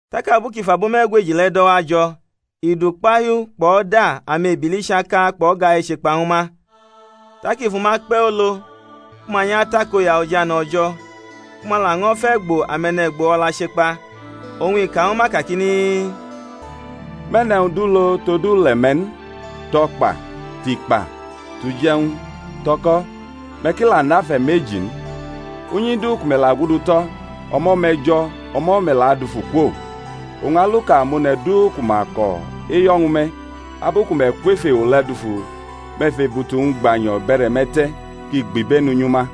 Tak abu kʼi fʼabo me̩gweji le̩ do̩wajo̩, i dʼukpahiu kpʼo̩da amebili chaka kpʼo̩ga e̩chekpa ñw ma. Tak i fʼuma kpe̩ olo ku ma nyʼatakoya ojane̩ O̩jo̩, ku ma laño̩ fʼe̩gbo̩ ame̩ne̩gbo o̩la chekpa. Oñ i ka ñw ma kakini, Me̩ nʼe̩wñ du lo tod ule̩-me̩ n, tʼo̩kpa, tʼikpa, tʼuje̩wñ, tʼo̩ko̩; me̩ ki la nʼafe̩ meji n. Unyi du ku me̩ la gudu tʼo̩, o̩mo̩ me̩ jo̩; o̩mo̩ me̩ la adufu kwo. Oñ aluka amone̩ du ku ma ko̩ eyo̩ ñw me̩, abu ku me̩ kwʼef ewo le̩ dufu, me̩ fʼebutu-wñ gbanyo̩ bʼe̩re̩-me̩ te̩ kʼi gbibenu nyʼuma.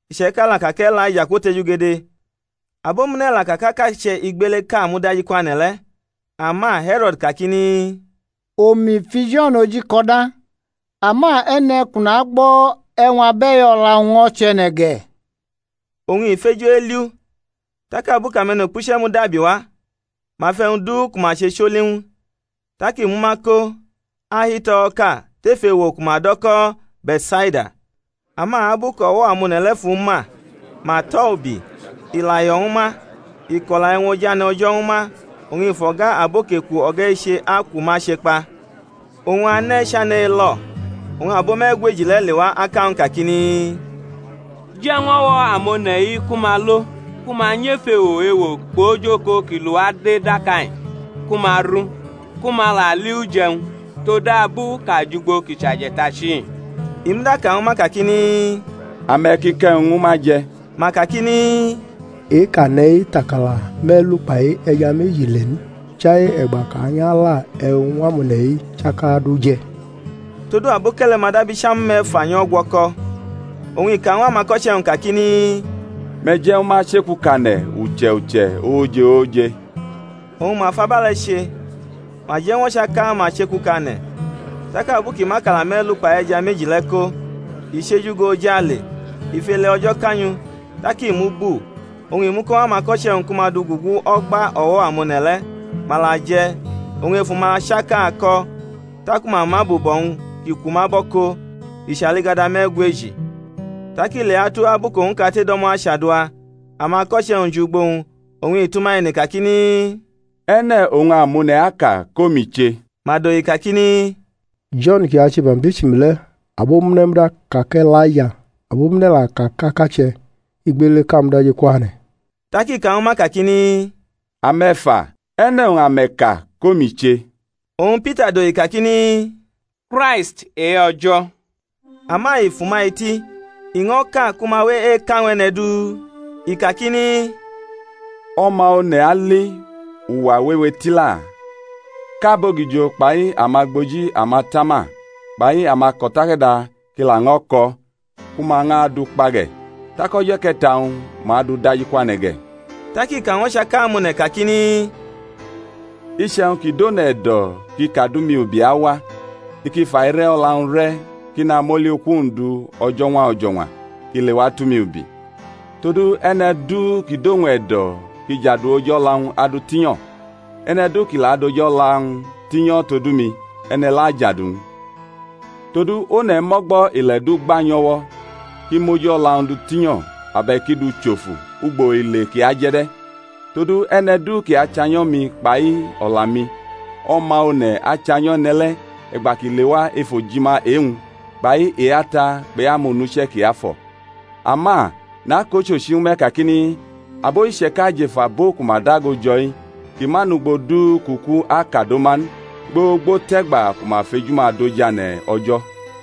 iche̩ka la ka kʼE̩laija kwotejugede; abomune̩ la ka kʼakache̩ igbeleʼka mudajikwane̩ le̩. Ama He̩ro̩d kakini, Omi fu Jo̩n oji ko̩da; ama e̩ne̩ kʼu nagbo̩ e̩wñ abe̩i o̩la-wñ ño̩ chʼe̩ne̩ ge̩? Oñ i feju eli u. Tak abu kʼame̩nukpuche̩ mudakubi wa, ma fʼe̩wñ du ku ma che choli ñw u. Tak i mʼuma ko, ahi tʼo̩wo̩ʼka tef ewo ku ma do̩ ko̩ Be̩tsaida. Ama abu kʼo̩wo̩-amone̩ le̩ fʼu ma, ma tʼo̩ ubi; i la yo̩ ñwu ma, i ko̩la e̩wñ ojane̩ O̩jo̩ ñwu ma, oñ i fʼo̩ga abo kʼeku o̩ga eche aku ma chekpa. Oñ ane̩ chane̩ elo̩; oñ abo me̩gweji le̩ lewa aka ñw u kakini, Je̩ ñw o̩wo̩ amone̩-i ku ma lo, ku ma nyʼef ewo ewo kpʼojoko ki lʼuwa de daka-i, ku ma ru, ku ma la li uje̩wñ; todabu kʼa jʼugbo ki chʼaje̩tachi-i. I muda ka ñwu ma kakini, Ame̩ ki kʼe̩wñ ñwu ma je̩. Ma kakini, E-kʼa ne̩ tʼakala me̩lu kpai e̩ja meji le n; chai e̩gba kʼa nyʼala e̩wñ ñw amone̩-i chaka du je̩. Todu aboke̩le̩ ma dab icham me̩fa nyʼo̩gwo̩ko̩. Oñ i ka ñw amako̩che̩-wñ kakini, Me̩ je̩ ñwu ma chekukane̩ uche̩ uche̩ ooje ooje. Oñ ma fʼabe̩le̩ che, ma je̩ ñw o̩chaka-ma chekukane̩. Tak abu kʼi mʼakala me̩lu kpai e̩ja meji le̩ ko, i chʼeju go ojale, i fʼele O̩jo̩ ka nyʼu, tak i mʼu bu, oñ i mʼu ko ñw amako̩che̩-wñ ku ma dugugu o̩gba o̩wo̩-amone̩ le̩. Ma la je̩, oñ efu-ma chaka ko̩; taku ma mʼabubo̩-wñ ki kwu ma bo̩ ko, i chʼaligada me̩gweji. Tak ileatu abu kʼowñ kate do̩mo̩ achadua, amako̩che̩-wñ jʼugbo-wñ; oñ i tʼuma ene kakini, E̩ne̩ oñ amone̩ aka kʼomi che? Ma dohi kakini, Jo̩n kʼi ache baptism le̩; abomune̩ muda aka kʼE̩laija, abomune̩ la aka kʼakache̩ igbeleʼka mudajikwane̩. Tak i ka ñwu ma kakini, Ame̩ fa, e̩ne̩ oñ ame̩ ka kʼomi che? Oñ Pita dohi kakini, Kraist e-O̩jo̩. Ama i fʼuma eti, iño̩ka ku ma we eka ñw e̩ne̩ du, i kakini, O̩ma One̩ ali uwa wewe tila, kʼabogijo kpai amagboji amatama kpai amako̩takada ki laño̩ kʼo̩, ku ma ñʼadʼu kpa ge̩, tak o̩jo̩ e̩ke̩ta-wñ ma adʼu dajikwane̩ ge̩. Tak i ka ñw o̩chaka amone̩ kakini, Iche̩wñ ki dʼone̩ e̩do̩ kʼi kadʼumi ubi awa, i ki fʼaire̩ o̩la-wñ re̩ kʼi namʼoli uku-wñ du o̩jo̩ñwa o̩jo̩ñwa, kʼi lewa tʼumi ubi. Todu e̩ne̩ du kʼi dʼowñ e̩do̩ kʼi jadu oji o̩la-wñ adʼu tinyo̩; e̩ne̩ du ki la adʼoji o̩la-wñ tinyo̩ todu mi, e̩ne̩ le̩ ajadu-wñ. Todu one̩ mʼo̩gbo̩ ile̩ du gba nyʼo̩wo̩, kʼi mʼoji o̩la-wñ du tinyo̩ abe̩k i dʼu chofu ugbo ile kʼi aje̩ de̩? Todu e̩ne̩ du kʼi achanyo̩ mi kpai o̩la-mi, O̩ma One̩ achanyo̩ e̩ne̩ le̩ e̩gba kʼi lewa ef ojima e-wñ kpai e-Ata kpʼe-amonuche̩ kiafo̩. Ama nakʼochochi ñwu me̩ kakini, Abo iche̩ka jʼef abo ku ma dago jo̩-i ki ma nʼugbo du kʼuku akado ma n gbogbo tʼe̩gba ku ma fejudʼojane̩ O̩jo̩.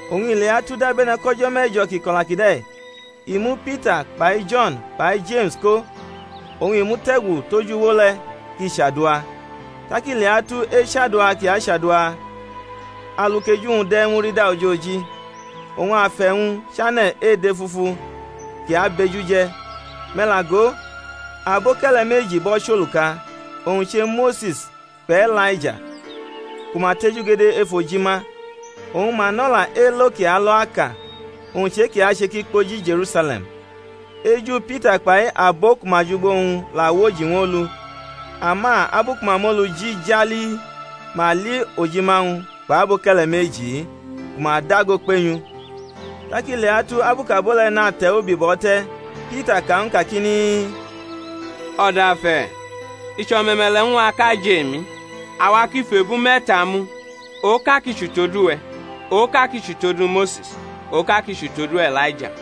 Oñ i leatu dabe̩ne̩ kʼo̩jo̩ me̩jo̩ kʼi kʼo̩la kide̩ i mu Pita kpai Jo̩n kpai Jeme̩s ko oñ i mute̩gu tʼoj uwo le̩ kʼi chadua. Tak i leatu echadua kʼi achadua alu kʼeju-wñ de̩ murida ojoji, oñ afe̩-wñ chane̩ edefufu kʼi abʼeju je̩. Me̩ la go, aboke̩le̩ meji bʼo̩ chʼoluka, owñ che Mose̩s kpʼE̩laija, ku ma tejugede ef ojima, oñ ma nʼo̩la elo kʼi alo aka, owñ chʼe-kʼi ache kʼi kpoji Je̩rusale̩m. Eju Pita kpai abo ku ma jʼugbo-wñ la woji ñw olu; ama abu ku ma moluji jali, ma li ojima-wñ kpʼaboke̩le̩ meji-i ku ma dago kpenyʼu. Tak i leatu abu kʼabo le̩ nate̩ ubi bʼo̩ te̩, Pita ka ñwu Jisus kakini, O̩dafe̩, i chʼo̩me̩me̩le̩ ñw a kʼa jʼemi; awa ki fʼebu me̩ta mu, oka ki chʼutodu we̩, oka ki chʼutodu Mose̩s, oka ki chʼutodu E̩laija—i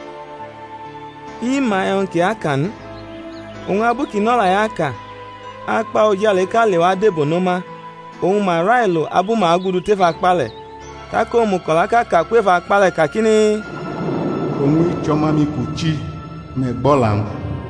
ma e̩wñ kʼi aka n. Oñ abu kʼi nʼo̩la-i aka akpa ojaleʼka lewa debono ma; oñ ma railo abu ma agudu tef akpa le̩. Tak omuko̩laʼka ka kwʼef akpa le̩ kakini, Owñ-i chʼO̩ma-mi kʼu chi; me̩ gbʼo̩la-wñ!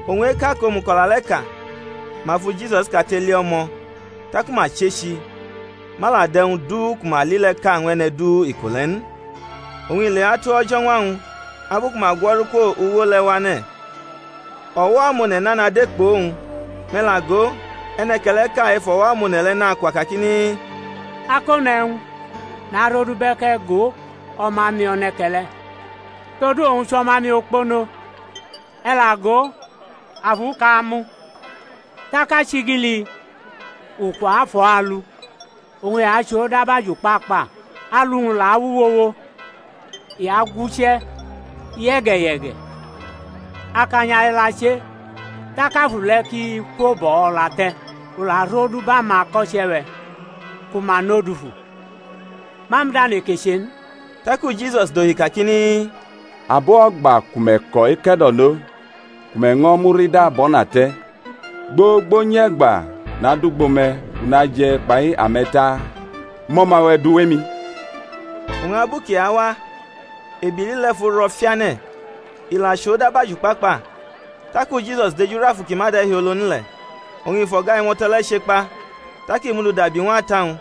Oñ eka kʼomuko̩la le̩ ka, ma fu Jisus kate li o̩mo̩. Taku ma chechi, ma la dʼe̩wñ du ku ma li le̩ ka ñw e̩ne̩ du iko le̩ n. Oñ i leatu o̩jo̩ñwa-wñ abu ku ma gwo̩ru kwʼoj uwo le̩ wane̩, o̩wo̩-amone̩ nana de kpʼowñ. Me̩ la go, e̩ne̩ke̩le̩ʼka ef o̩wo̩-amone̩ le̩ nakwa kakini, Akone̩wñ, narodubʼe̩ kʼe̩ go o̩ma-mi e̩ne̩ke̩le̩, todu owñ chʼo̩ma-mi okpono; e̩ la go, afuʼka amʼu, tak achigili ukwa afʼo̩ alu; oñ i achʼo dab ajukpakpa, alu-wñ la awuwowo, i aguche̩ ye̩ge̩ye̩ge̩, akanya i la che tak afu le̩ ki kwobʼo̩ o̩la te̩, u la rodubʼamako̩che̩-we̩ ku ma nʼo dufu, ma muda neke che n. Taku Jisus dohi kakini, Abo o̩gba ku me̩ ko̩ eke̩do̩no ku me̩ ño̩ murida bʼo̩na te̩, gbogbo nyʼe̩gba nadʼugbo me̩, kʼu naje̩ kpai ame̩ taa? Mʼo̩ma-we̩ du wʼemi. Oñ abu kʼi awa, ebili le̩ fʼu ro̩ fiane̩, i la chʼo dab ajukpakpa. Taku Jisus dejurʼafu ki ma de̩hiolo n le̩, oñ i fʼo̩ga imo̩to̩ le̩ chekpa, tak i mʼu dudabi ñw ata-wñ.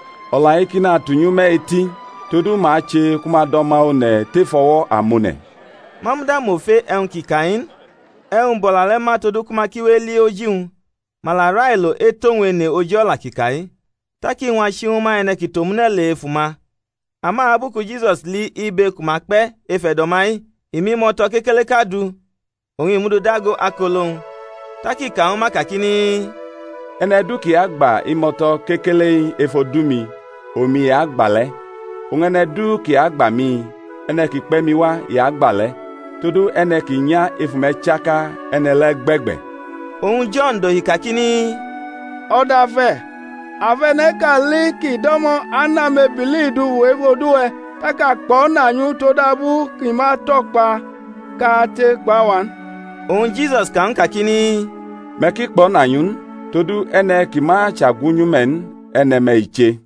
O̩la-i ki natunyʼume̩ eti; todu ma ache ku ma dʼO̩ma One̩ tef o̩wo̩ amone̩. Ma muda mʼofe e̩wñ kʼi ka-i n, e̩wñ bʼo̩la le̩ ma todu ku ma ki we eli oji-wñ; ma la railo etʼowñ ene oji o̩la kʼi ka-i. Tak iñwa chi ñwu ma, e̩ne̩ ki tʼomune̩ le̩ efu-ma. Ama abu ku Jisus li ibe ku ma kpe̩ ef e̩do̩-ma-i, i mʼimo̩to̩ kekeleʼka du, oñ i mʼu du dago akolo-wñ; tak i ka ñwu ma kakini, E̩ne̩ du ki agba imo̩to̩ kekele-i ef odu-mi, omi i gba le̩, oñ e̩ne̩ du kʼi agba mi, e̩ne̩ kʼi kpe̩ mi wa i agba le̩; todu e̩ne̩ ki nya efu me̩ chaka, e̩ne̩ le̩ gbe̩gbe̩. Oñ Jo̩n dohi kakini, O̩dafe̩, a fʼe̩ne̩ʼka li kʼi do̩mo̩ ane amebili dufu ef odu-we̩, tak a kpo̩na nyʼu todabu kʼi ma tʼo̩kpa kate kpʼawa n. Oñ Jisus ka ñw u kakini, Me̩ ki kpo̩na nyʼu n; todu e̩ne̩ kʼi ma chʼagwunyʼume̩ n, e̩ne̩-me̩ i che.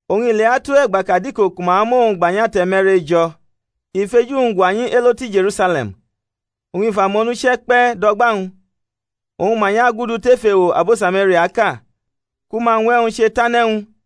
Oñ i leatu e̩gba kʼadiko ku ma amʼowñ gba nyʼate̩ me̩rejo̩, i fʼeju-wñ gwanyi elo tu Je̩rusale̩m, oñ i fʼamonuche̩ kpe̩ dʼo̩gba-wñ; oñ ma nyʼagudu tef ewo abo Samariaʼka, ku ma ñw e̩wñ chetane̩ ñw u.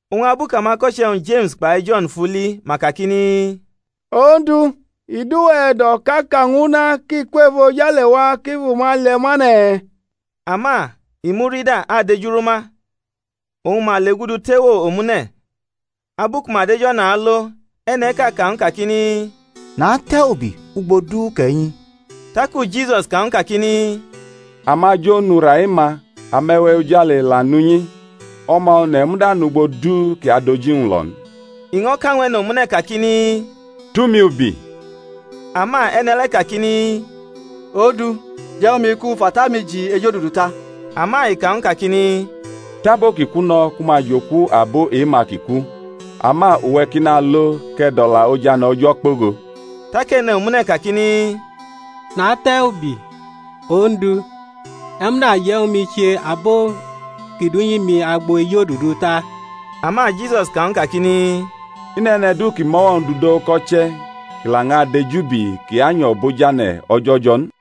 Oñ abu kʼamako̩che̩-wñ, Jeme̩s kpai Jo̩n fʼu li ma kakini, Ondu, i dʼuwe̩ e̩do̩ kʼa ka ñw una ki kwʼefojale wa kʼi fʼuma lie̩ ma ne̩? Ama i murida adejuru ma. Oñ ma legudu tʼewo omune̩. Abu ku ma dʼej o̩na alo, e̩ne̩ʼka ka ñw u kakini, Natʼe̩ ubi ugbo du kʼe̩ nyi. Taku Jisus ka ñw u kakini, Amajo nʼura e-ma, ame̩we̩ ojale la nʼunyi, O̩ma One̩ muda nʼugbo du kʼi adʼoji-wñ lo n. I ño̩ ka ñw e̩ne̩ omune̩ kakini, Tʼumi ubi. Ama e̩ne̩ le̩ kakini, Ondu, je̩ ñwu mi kʼu fʼata-mi ji ejodudu ta. Ama i ka ñw u kakini, Tʼabo ki ku no̩ ku ma jʼoku abo e-ma ki ku, ama uwe̩ ki nalo kʼe̩ dʼo̩la ojane̩ O̩jo̩ kpogo. Tak e̩ne̩ omune̩ kakini, Natʼe̩ ubi, Ondu, e̩ muda je̩ ñwu mi che abo ki dʼunyi-mi agbo ejodudu ta. Ama Jisus ka ñw u kakini, I nʼe̩ne̩ du ki mʼo̩wo̩-wñ dudo uko̩che̩ kʼi la ñʼadejubi, kʼi anyo̩ bʼojane̩ O̩jo̩ jo̩ n.